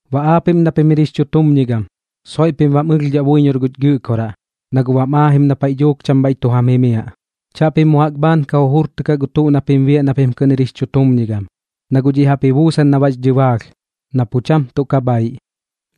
Baꞌ aapiꞌm na pim jir jix chutumñigam, soiꞌ pim bam ɨlhdhaꞌ buiñor guch Gɨꞌkoraꞌ, na guꞌ bam aajim na paiꞌ dhuuk cham bhaiꞌ tu jam jimiaꞌ. Chaꞌpim mu jaꞌk bhaan ka jujurtɨkaꞌ gu tuꞌ na pim biaꞌ na pim kɨꞌn jir jix chutumñigam, na guꞌ dhiꞌ jaꞌp ji buusan na bax dhɨbaalh, na pu cham tuꞌ ka bhaiꞌ.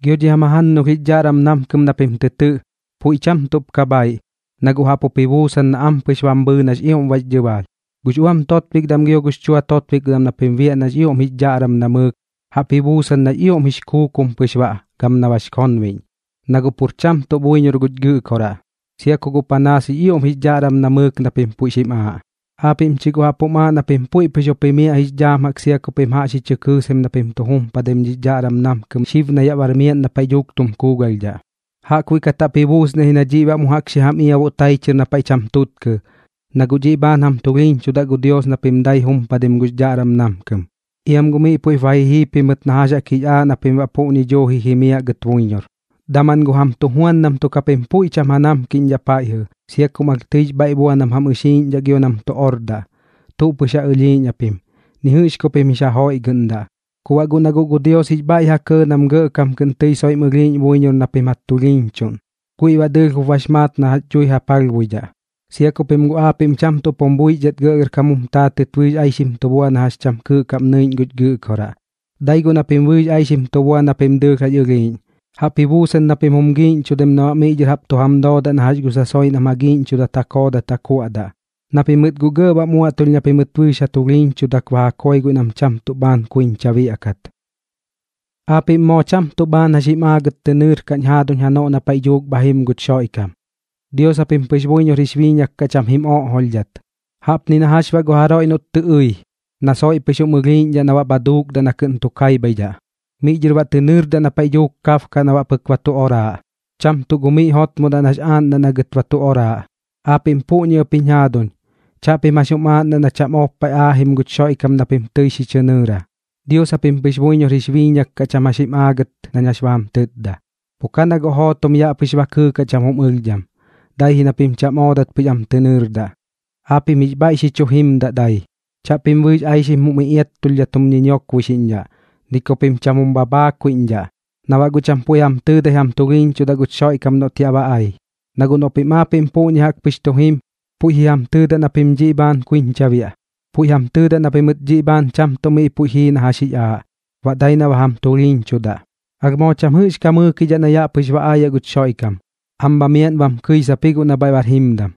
Gio dhi jam jajannulh jix dhaꞌram namkɨm na pim tɨ tɨꞌ, puiꞌ cham tuꞌp ka bhaiꞌ, na guꞌ jaꞌp jup ji buusan na ampɨx bam bhɨɨ nax ioꞌm bax dhɨbaalh. Gux uam totbikdam gio gux chua totbikdam na pim biaꞌ nax ioꞌm jix dhaꞌram namɨɨk, jaꞌp ji buusan nax ioꞌm jix kuukum pɨx baꞌ gam na bax konbiꞌñ, na guꞌ pur cham tuꞌ buiñor guch Gɨꞌkoraꞌ, sia ku guꞌ panaas jix ioꞌm jix dhaꞌram namɨɨk na pim puiꞌ xim aaꞌ. Aapiꞌm chi guꞌ jaꞌp jum aaꞌ na pim puiꞌ pɨx jup jimiaꞌ jix dhaam jaꞌk sia ku pim jaꞌx ji chɨ kɨɨsaim na pim jumpadaim dhix dhaꞌram namkɨm xib na yaꞌ bar miaꞌn na paiꞌ dhuuk tum kuugalhdhaꞌ. Jaꞌkbuiꞌ kat jaꞌp ji buusniaꞌ ji na dhiꞌ baꞌ mu jaꞌk xi jam iabuꞌ tai chɨr na paiꞌ cham tutkɨ, na guꞌ dhiꞌ bhaan jam tulhiiñchudaꞌ gu Dios na pim dai jumpadim gux dhaꞌram namkɨm, iam guꞌ miꞌ puiꞌp ba ji jii pimɨt na jax jix aaꞌ na pim baꞌ puꞌñi duuji jimiaꞌ gɨt buiñor. Daman gu jam tujuandam tuk japim puiꞌ pu cham ja namkidhaꞌ paiꞌjɨ, sia kum alh tɨix bhaiꞌ bua nam jam ɨxiiꞌñdhaꞌ gio nam tu ordaꞌ. Tuꞌ pɨx ja ɨlhiiꞌñdhaꞌ pim, ni jɨꞌx ku pim jix ja joiꞌgɨꞌndaꞌ. Ku baꞌ guꞌ na guꞌ gu Dios jix bhaiꞌ ja kɇɇ nam gɇꞌkam kɨꞌn tɨi soiꞌm ɨlhiiꞌñ buiñor na pim ja tulhiiñchuꞌn, guiꞌ baꞌ dɨɨlh jup bax maat na jax dhui ja palhbuidhaꞌ, sia ku pim guꞌ aapiꞌm cham tuꞌp jum buixdhat gɇꞌgɇrkam jum taatɨt bɨɨx aixim tu bua na jax cham kɨɨꞌ kaꞌm nɨiꞌñ guch Gɨꞌkoraꞌ, dai guꞌ na pim bɨɨx aixim tu bua na pim dɨɨlh jax ɨlhiiꞌñ. Jaꞌp ji buusan na pim jum giiꞌñchudaim na baꞌ miꞌ dhɨr jaꞌp tu jam doodaꞌ na jax gu sasoiꞌ nam ja giiꞌñchudat ja koodat ja kuaꞌdaꞌ, na pimɨt guꞌ gɇꞌ bam uaꞌtulh na pimɨt bɨɨx ja tulhiiñchudak ba ja koi guiꞌ nam cham tuꞌ bhaan kuiñcha biaꞌkat. Aapiꞌm moo cham tuꞌ bhaan jax jim aagɨt tɨ nɨɨrkaꞌñ jaduuñ janoꞌ na paiꞌ dhuuk bha jim guch Xoiꞌkam, Dios japim pɨx buiñor jix biiñak kaꞌ cham jim oꞌjolhdhat. Jaꞌpni na jax baꞌ gu jaroiꞌ noꞌt tɨ ɨi, na guꞌ soiꞌ pɨx jum ɨlhiiꞌñdhaꞌ na baꞌ bha duukdaꞌ na kɨꞌn tu kaibhaidhaꞌ, miꞌ dhɨr baꞌ tɨ nɨɨrdaꞌ na paiꞌ kabkaꞌ na baꞌ pɨk ba tu oraaꞌ, cham tuꞌ gu miꞌ jotmodaꞌ nax aaꞌndaꞌ na gɨt ba tu oraaꞌ. Aapiꞌm puꞌñi ɨp jiñ jaaduñ, chaꞌpim jax jum aaꞌndaꞌ na cham ob paiꞌ aajim guch Xoiꞌkam na pim tɨi xi chɨ nɨɨra, Dios japim pɨx buiñor jix biiñak kaꞌ cham jax jim aagɨt nañ jax ba jam tɨtda. Pu ka na guꞌ jootom yaꞌ pɨx ba kɨɨkaꞌ cham jum ɨlhdham, dai ji nach cham oodat pɨx am tɨ nɨɨrdaꞌ. Aapiꞌm jix bhaiꞌ xi chu jimdaꞌ dai. Chaꞌpim bɨɨx aixim jum iꞌiattulhdhat jum ñiñiokboixiꞌñdhaꞌ, ni ku pim cham jum bhabhaakuiꞌñdhaꞌ, na baꞌ guꞌ cham puiꞌ jam tɨɨdai jam tulhiiñchudaꞌ guch Xoiꞌkam noꞌt yaꞌ ba ai. Na guꞌ noꞌ pim aapiꞌm puꞌñi jaꞌk pɨx tu jim, puiꞌ ji jam tɨɨdaꞌ na pim dhiꞌ bhaan kuiñcha biaꞌ, puiꞌ jam tɨɨdaꞌ na pimɨt dhiꞌ bhaan cham tuꞌ miꞌ puiꞌ jii na jax jix aaꞌ, baꞌ dai na ba jam tulhiiñchudaꞌ. Alh moo cham jɨꞌx ka mɨɨkidhaꞌ ji guꞌ na yaꞌ pɨx ba aayaꞌ guch Xoiꞌkam, am bha miaꞌn bam kɨisap ji guꞌ na bhaiꞌ bar jimdam.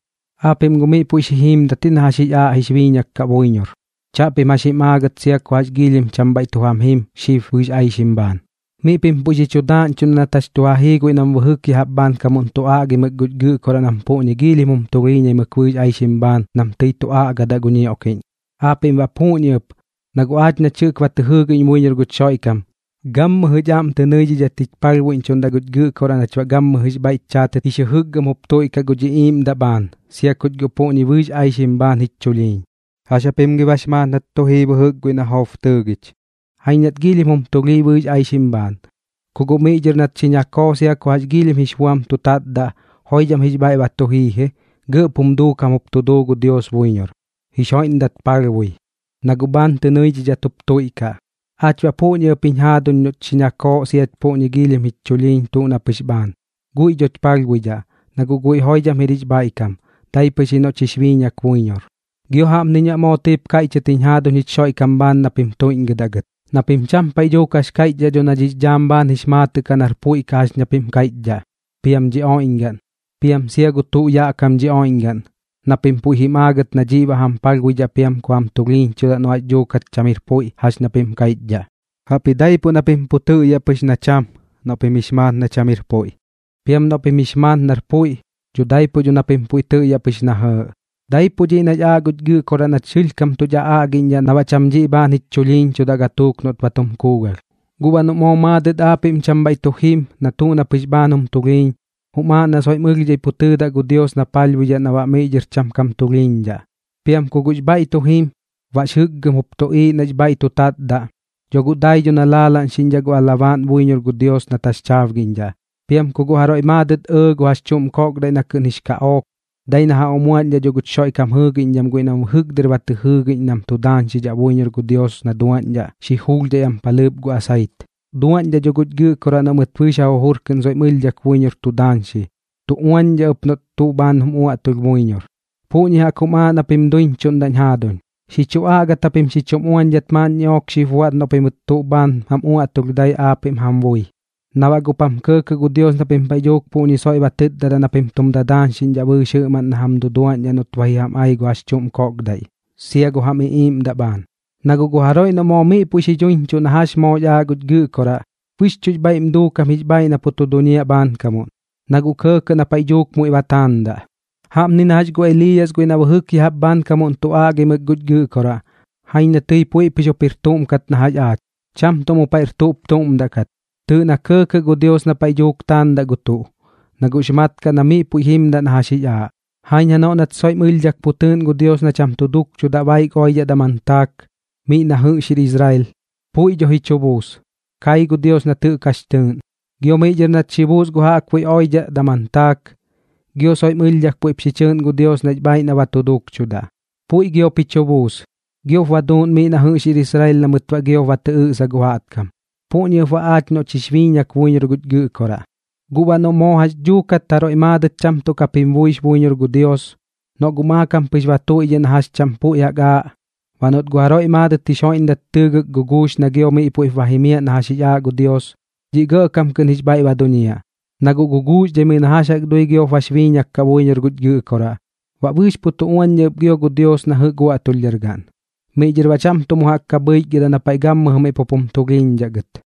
Aapiꞌm guꞌ miꞌ puiꞌ xi jiimdat ji na jax jix aaꞌ jix biiñak kaꞌ buiñor, chaꞌpim jax jim aagɨt sia ku jax giilhim cham bhaiꞌ tu jam jim xib bɨɨx aixim bhaan. Miꞌ pim puiꞌ xi chu daaꞌñchuꞌndaꞌ nat jax tu ja jii guiꞌ nam bɨjɨk ya jaꞌp bhaankamuꞌn tu aꞌgimɨk guch Gɨꞌkoraꞌ nam puꞌñi giilhim jum tulhiiñaimɨk bɨɨx aixim bhaan nam tɨi tu aꞌgadaꞌ gu ñioꞌkiꞌñ. Aapiꞌm baꞌ puꞌñi ɨp, na guꞌ aach nach jɨꞌk ba tɨ jɨɨgiꞌñ buiñor guch Xoiꞌkam, gammɨjɨ jich aꞌm tɨ nɨidhidhat jich palhbuiꞌñchuꞌ guch Gɨꞌkoraꞌ nach baꞌ gammɨjɨx bhaiꞌch chaatɨt jix jɨjɨkgɨm jup tuiꞌkaꞌ guch iꞌiiꞌmdaꞌ bhaan, sia kuch puꞌñi bɨɨx aixim bhaan jich chulhiiñ. ¿Jax japim gi bax maat nat tu jii bɨjɨk guiꞌ na Job tɨɨgich? Jaiñ nat giilhim jum tulhii bɨɨx aixim bhaan, ku guꞌ miꞌ nat xi ñakoo sia ku jax giilhim jix buam tu tatdaꞌ, joidham jix bhaiꞌ tu jii ji, gɇꞌp jum duukam jup tu duu gu Dios buiñor, jix joiꞌndat palhbui, na guꞌ bhaan tɨ nɨidhidhat jup tuiꞌkaꞌ. Aach baꞌ puꞌñi ɨp jiñ jaaduñ noꞌch xi ñakooꞌ siach puꞌñi giilhim jich chulhiiñ tuꞌ na pɨx bhaan, guiꞌ dhoch palhbuidhaꞌ, na guꞌ guiꞌ joidham jir jix bhaiꞌkam, dai pɨx ji noꞌch jix biiñak buiñor. Gio jaꞌpniñ baꞌ moo tɨip kaiꞌchɨt jiñ jaduuñ jich Xoiꞌkam bhaan na pim tuiꞌñgɨdaꞌ gɨt, na pim cham paiꞌ dhuuk jax kaiꞌchdhaꞌ dho na dhix dhaam bhaan jix maatɨꞌ kaꞌ nar puiꞌ kaꞌ jax na pim kaiꞌchdhaꞌ, piam dhi oiꞌñgaꞌn, piam sia gu tuꞌ yaꞌ kam dhi oiꞌñgaꞌn, na pim puiꞌ jim aagɨt na dhiꞌ baꞌ jam palhbuidhaꞌ piam ku jam tulhiiñchudaꞌ noꞌ jax dhuukat cham jir puiꞌ jax na pim kaiꞌchdhaꞌ. Jaꞌpji daipuꞌ na pim pu tɨꞌyaꞌ pɨx na cham noꞌ pim jix maat na cham jir puiꞌ. Piam noꞌ pim jix maat nar puiꞌ, dho daipuꞌ na pim pu tɨꞌyaꞌ pɨx na jɇɇꞌ. Daipuꞌ dhiꞌ nax aaꞌ guch Gɨꞌkoraꞌ nach sɨlhkam tuch aꞌaꞌgiꞌñdhaꞌ na baꞌ cham dhiꞌ bhaan jich chulhiiñchudaꞌ gatuuk noꞌt ba tum kuugalh. Guꞌ baꞌ noꞌ moo maadɨt aapiꞌm cham bhaiꞌ tu jim na tuꞌ na pɨx bhaan jum tulhiiñ, jum aaꞌ na soiꞌm ɨlhdhai pu tɨɨdaꞌ gu Dios na palhbuidhaꞌ na baꞌ miꞌ dhɨr cham kam tulhiiñdhaꞌ. Piam ku guꞌx bhaiꞌ tu jim, baꞌx jɨkgɨm jup tuꞌiiꞌ nax bhaiꞌ tu tatdaꞌ, dho guꞌ dai dho na laalaꞌñxiꞌñdhaꞌ gu alabaaꞌn buiñor gu Dios na taxchaabgiꞌñdhaꞌ. Piam ku guꞌ jaroiꞌ maadɨt ɇɇ gu jax chuꞌm kokdaiꞌ na kɨꞌn jix kaꞌook, dai na ja umuaꞌñdhaꞌ dho guch Xoiꞌkam jɨɨgiꞌñdham guiꞌ nam jɨꞌk bɨjɨk dɨr ba tɨ jɨɨgiꞌñ nam tu daañxidhaꞌ buiñor gu Dios na duaꞌñdhaꞌ xi juulhdhai am palhɨɨp gu asait. Duaꞌñdhaꞌ dho guch Gɨꞌkoraꞌ noꞌ mɨt bɨɨx ja jujur kɨꞌn soiꞌm ɨlhdhak buiñor tu daañxi, tu uaꞌñdhaꞌ ɨp noꞌt tuꞌ bhaan jum uaꞌtulh buiñor. Puꞌñi jaꞌk jum aaꞌ na pim duiñchuꞌndaꞌñ jaaduñ. Xi chu aꞌgat japim xi chum uañdhat maaꞌn ñiꞌook xip buaꞌt noꞌ pimɨt tuꞌ bhaan mam uaꞌtulh dai aapiꞌm jam bui, na baꞌ guꞌp jam kɇɇkɇꞌ gu Dios na pim paiꞌ dhuuk puꞌñi soiꞌ ba tɨtdadaꞌ na pim tum daañxiꞌñdhaꞌ bɨɨx jɨꞌmaꞌn na jam duduaꞌñdhaꞌ noꞌt ba ji jam ai gu jax chuꞌm koꞌkdaiꞌ, sia gu jam iꞌiiꞌmdaꞌ bhaan. Na guꞌ gu jaroiꞌ noꞌ moo miꞌ puiꞌ xi dhuiñchuꞌ na jax jaꞌk moox aaꞌ guch Gɨꞌkoraꞌ, bɨxchuꞌx bhaiꞌm duukam jix bhaaiꞌ na pu tu duñiaꞌ bhaankamuꞌn, na guꞌ kɇɇkɇꞌ na paiꞌ dhuuk muiꞌ ba taandaꞌ. Jaꞌpni na jax gu Eliiyas guiꞌ na bɨjɨk ya jaꞌp bhaankamuꞌn tu aꞌgimɨk guch Gɨꞌkoraꞌ. Jaiñ na tɨi puiꞌ pɨx jup jir tuꞌm kat na jax aach, cham tuꞌ mu paiꞌr tuꞌp tuꞌm daꞌ kat. Tɨɨꞌ na kɇɇkɇꞌ gu Dios na paiꞌ dhuuk taandaꞌ gu tuꞌ, na guꞌx mat kaꞌ na miꞌ puiꞌ jimdaꞌ na jax jix aaꞌ. Jaiñ janoꞌ nat soiꞌm ɨlhdhat pu tɨɨꞌn gu Dios na cham tu duukchudaꞌ baik oidhaꞌ daman taak miꞌ na jɨꞌx jir Israel. Puiꞌ dho ji chu buus, kai gu Dios nat jɨꞌk jax tɨɨꞌn. Gio miꞌ dhɨr nat xi buus gu jaꞌkbuiꞌ baik oidhaꞌ daman taak, gio soiꞌm ɨlhdhak puiꞌp xi chɨɨꞌn gu Dios nax bhaaiꞌ na ba tu duukchudaꞌ. Puiꞌ giop ji chu buus, giop ba duuꞌn miꞌ na jɨꞌx jir Israel na mɨt baꞌ giop ba tɨ ɨꞌsa gu jaꞌtkam. Puꞌñi ɨp baꞌ aach noꞌch moox biiñak buiñor guch Gɨꞌkoraꞌ. Guꞌ baꞌ noꞌ moo jax dhuukat jaroiꞌ maadɨt cham tuꞌ kap jim buix buiñor gu Dios, noꞌ guꞌ maakam pɨx ba tuiꞌdhiꞌ na jax cham puiꞌ jaꞌk aaꞌ, baꞌ noꞌt guꞌ jaroiꞌ maadɨt jix joiꞌndak tɨɨgɨk guguux na gio miꞌ puiꞌp ba jimiaꞌ na jax jix aaꞌ gu Dios, dhiꞌ gɇꞌkam kɨꞌn jix bhaiꞌ ba duñiaꞌ, na guꞌ guguuxdhaimɨi na jax jaꞌk dui giop bax biiñak kaꞌ buiñor guch Gɨꞌkoraꞌ, baꞌ bɨɨx pu tu uañdhaꞌ ɨp gio gu Dios na jɨꞌk uaꞌtulhdhargaꞌn. Miꞌ dhɨr baꞌ cham tuꞌ mu jaꞌk ka bhɨichgɨdaꞌ na paiꞌ gammɨjɨ miꞌ pup jum tulhiiñdhaꞌ gɨt.